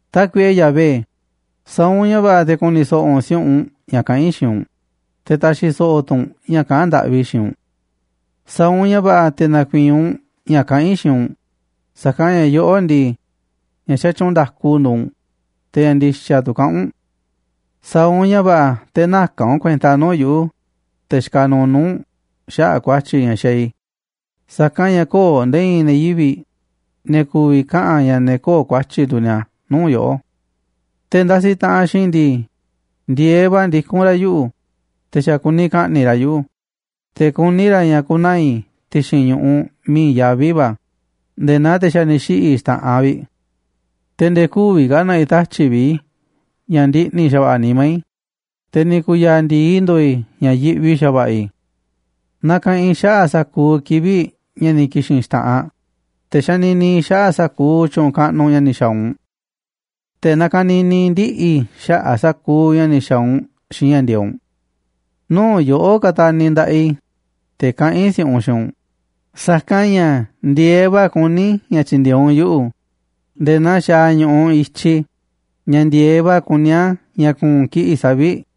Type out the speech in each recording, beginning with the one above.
Tákuiꞌe Yahvé, sa̱a̱ u̱nꞌ ña̱ va̱ꞌa̱ te̱ ku̱ni̱ so̱ꞌo̱ u̱nꞌ si̱u̱ꞌunꞌ ña̱ kaꞌán i̱ xiinꞌ u̱nꞌ, te̱ ta̱xi̱ so̱ꞌo̱ tu̱ u̱nꞌ ña̱ kaꞌán ndaꞌvi i̱ xiinꞌ u̱nꞌ. Sa̱a̱ u̱nꞌ ña̱ va̱ꞌa̱ te̱ na̱ku̱i̱i̱n u̱nꞌ ña̱ kaꞌán i̱ xiinꞌ u̱nꞌ, sa̱kanꞌ ña̱ yoꞌó ndii, ña̱ xatyuunꞌ nda̱ku nduuꞌ u̱nꞌ, te̱ ña̱ ndi̱xa̱ tu̱ kaꞌán u̱nꞌ. Sa̱a̱ u̱nꞌ ña̱ va̱ꞌa̱ te̱ näka̱n u̱nꞌ kuenta nuu̱ꞌ yuꞌu̱, te̱ xikaꞌ nuuꞌ nuu̱ꞌ u̱nꞌ, xaꞌa̱ꞌ ku̱a̱tyi̱ ña̱ xaaꞌ i̱, sa̱kanꞌ ña̱ köo̱ꞌ nde̱e̱ i̱i̱n ne̱ yivi̱ꞌ ne̱ ku̱vi̱ kaꞌa̱n ña̱ ne̱ köo̱ꞌ ku̱a̱tyi̱ nduuꞌ ni̱a̱ nuu̱ꞌ yoꞌó. Te̱ ndasiꞌ taꞌanꞌ xiinꞌ i̱ ndii, ndi̱e̱eꞌ va̱ ndikún ra̱ yuꞌu̱, te̱ xa̱ kuni ka̱ꞌni̱ꞌ ra̱ yuꞌu̱, te̱ kuní ra̱ ña̱ ku̱naa̱ i̱ ti̱xi̱n ñu̱ꞌuꞌ miiꞌ i̱i̱n yaví va̱ nde̱e̱ naa te̱ xa̱ ni̱ xiꞌi̱ xta̱ꞌanꞌ vi̱ꞌ. Te̱ nde̱e̱ kü̱vi̱ ka̱ na̱ꞌi̱ tatyi̱ꞌ vi̱ꞌ i̱ ña̱ ndiꞌni̱ xa̱va̱ꞌa̱ nimá i̱, te̱ ni̱ ku̱ya̱a̱ ndi̱i ndo̱o̱ i̱ ña̱ yiꞌvi xa̱va̱ꞌa̱ i̱. Nakaꞌanꞌ i̱ xaꞌa̱ꞌ sa̱kuuꞌ kivi̱ꞌ ña̱ ni̱ ki̱xi̱n xta̱ꞌanꞌ, te̱ xanini i̱ xaꞌa̱ꞌ sa̱kuuꞌ tyu̱u̱n kaꞌnuꞌ ña̱ ni̱ xa̱a̱ u̱nꞌ. Te̱ nakanini i̱ ndiꞌi̱ i̱ xaꞌa̱ꞌ sa̱kuuꞌ ña̱ ni̱ xa̱a̱ u̱nꞌ xiinꞌ ña̱ ndi̱e̱eꞌ u̱nꞌ. Nuu̱ꞌ yoꞌó kataniꞌ nda̱ꞌaꞌ i̱, te̱ kaꞌán i̱ si̱u̱ꞌunꞌ xiinꞌ u̱nꞌ, sa̱kanꞌ ña̱ ndi̱e̱eꞌ va̱ kuní i̱ ña̱ tyi̱ndi̱e̱eꞌ u̱nꞌ yuꞌu̱ nde̱e̱ naa xaaꞌ ñu̱ꞌuꞌ i̱tyiꞌ ña̱ ndi̱e̱eꞌ va̱ kuní a̱ ña̱ ku̱u̱n kiꞌi̱ꞌ savi̱ꞌ.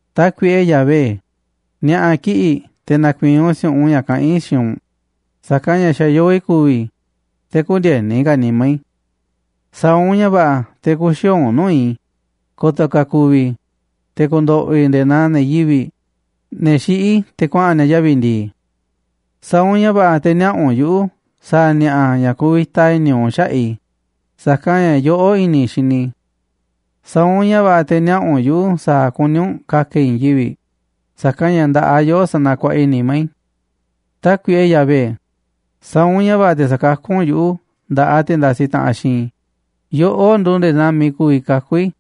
Tákuiꞌe Yahvé, ni̱a̱ꞌa̱ kiꞌi̱ꞌ te̱ na̱ku̱i̱i̱n u̱nꞌ si̱u̱ꞌunꞌ ña̱ kaꞌán i̱ xiinꞌ u̱nꞌ, sa̱kanꞌ ña̱ xa̱ yoo i̱ ku̱vi̱ i̱, te̱ kü̱ndi̱e̱ni ka̱ nimá i̱. Sa̱a̱ u̱nꞌ ña̱ va̱ꞌa̱ te̱ kü̱xi̱o̱o̱ u̱nꞌ nuu̱ꞌ i̱, ko̱to̱ ka̱ ku̱vi̱ i̱, te̱ ku̱ndo̱ꞌo̱ i̱ nde̱e̱ naa ne̱ yivi̱ꞌ, ne̱ xiꞌí te̱ kuaꞌa̱n ni̱a̱ yavi̱ ndi̱i̱. Sa̱a̱ u̱nꞌ ña̱ va̱ꞌa̱ te̱ niaꞌa̱ u̱nꞌ yuꞌu̱ sa̱a̱ ni̱a̱ꞌa̱ ña̱ kuvita i̱ni̱ u̱nꞌ xaꞌa̱ꞌ i̱, sa̱kanꞌ ña̱ yoꞌó i̱ni̱ i̱ xini i̱. Sa̱a̱ u̱nꞌ ña̱ va̱ꞌa̱ te̱ niaꞌa̱ u̱nꞌ yuꞌu̱ sa̱a̱ kuní u̱nꞌ ka̱ka̱ i̱ i̱i̱n yivi̱ꞌ, sa̱kanꞌ ña̱ nda̱ꞌaꞌ yoꞌó sanakuaꞌa i̱ nimá i̱. Tákuiꞌe Yahvé, sa̱a̱ u̱nꞌ ña̱ va̱ꞌa̱ te̱ sa̱kakú u̱nꞌ yuꞌu̱ nda̱ꞌaꞌ te̱ ndasiꞌ taꞌanꞌ xiinꞌ i̱, yoꞌó nduuꞌ nde̱e̱ naa miiꞌ ku̱vi̱ kakú i̱.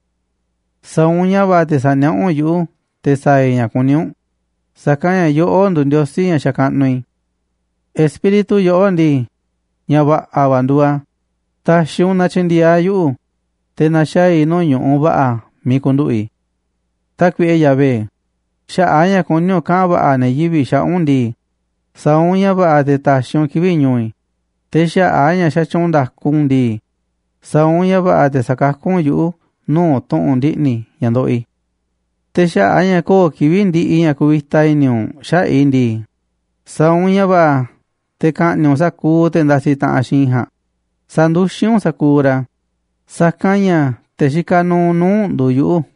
Sa̱a̱ u̱nꞌ ña̱ va̱ꞌa̱ te̱ sa̱niaꞌá u̱nꞌ yuꞌu̱ te̱ sa̱a̱ i̱ ña̱ kuní u̱nꞌ, sa̱kanꞌ ña̱ yoꞌó nduuꞌ Ndiosí ña̱ xakaꞌnuꞌ i̱. Espíritu yoꞌó ndii, ña̱ va̱ꞌa̱ va̱ nduuꞌ a̱ ta̱xi̱ u̱nꞌ na tyi̱ndi̱e̱eꞌ a̱ yuꞌu̱, te̱ na̱xaa̱ i̱ nuu̱ꞌ ñu̱ꞌuꞌ va̱ꞌa̱ miiꞌ ku̱nduꞌu̱ꞌ i̱. Tákuiꞌe Yahvé, xaꞌa̱ꞌ a̱ ña̱ kuní u̱nꞌ kaꞌa̱n va̱ꞌa̱ ne̱ yivi̱ꞌ xaꞌa̱ꞌ u̱nꞌ ndii, sa̱a̱ u̱nꞌ ña̱ va̱ꞌa̱ te̱ ta̱xi̱ u̱nꞌ kivi̱ꞌ ñu̱u̱ i̱, te̱ xaꞌa̱ꞌ a̱ ña̱ xatyuunꞌ nda̱ku u̱nꞌ ndii, sa̱a̱ u̱nꞌ ña̱ va̱ꞌa̱ te̱ sa̱kakú u̱nꞌ yuꞌu̱ nuu̱ꞌ tu̱ꞌu̱n ndiꞌni̱ ña̱ ndoꞌoꞌ i̱. Te̱ xaꞌa̱ꞌ a̱ ña̱ köo̱ꞌ kivi̱ꞌ ndiꞌiꞌ ña̱ kuvita i̱ni̱ u̱nꞌ xaꞌa̱ꞌ i̱ ndii, sa̱a̱ u̱nꞌ ña̱ va̱ꞌa̱ te̱ ka̱ꞌni̱ꞌ u̱nꞌ sa̱kuuꞌ te̱ ndasiꞌ taꞌanꞌ xiinꞌ i̱ ja̱a̱nꞌ, sa̱nduxín u̱nꞌ sa̱kuuꞌ ra̱, sa̱kanꞌ ña̱ te̱ xikaꞌ nuuꞌ nuu̱ꞌ u̱nꞌ nduuꞌ yuꞌu̱.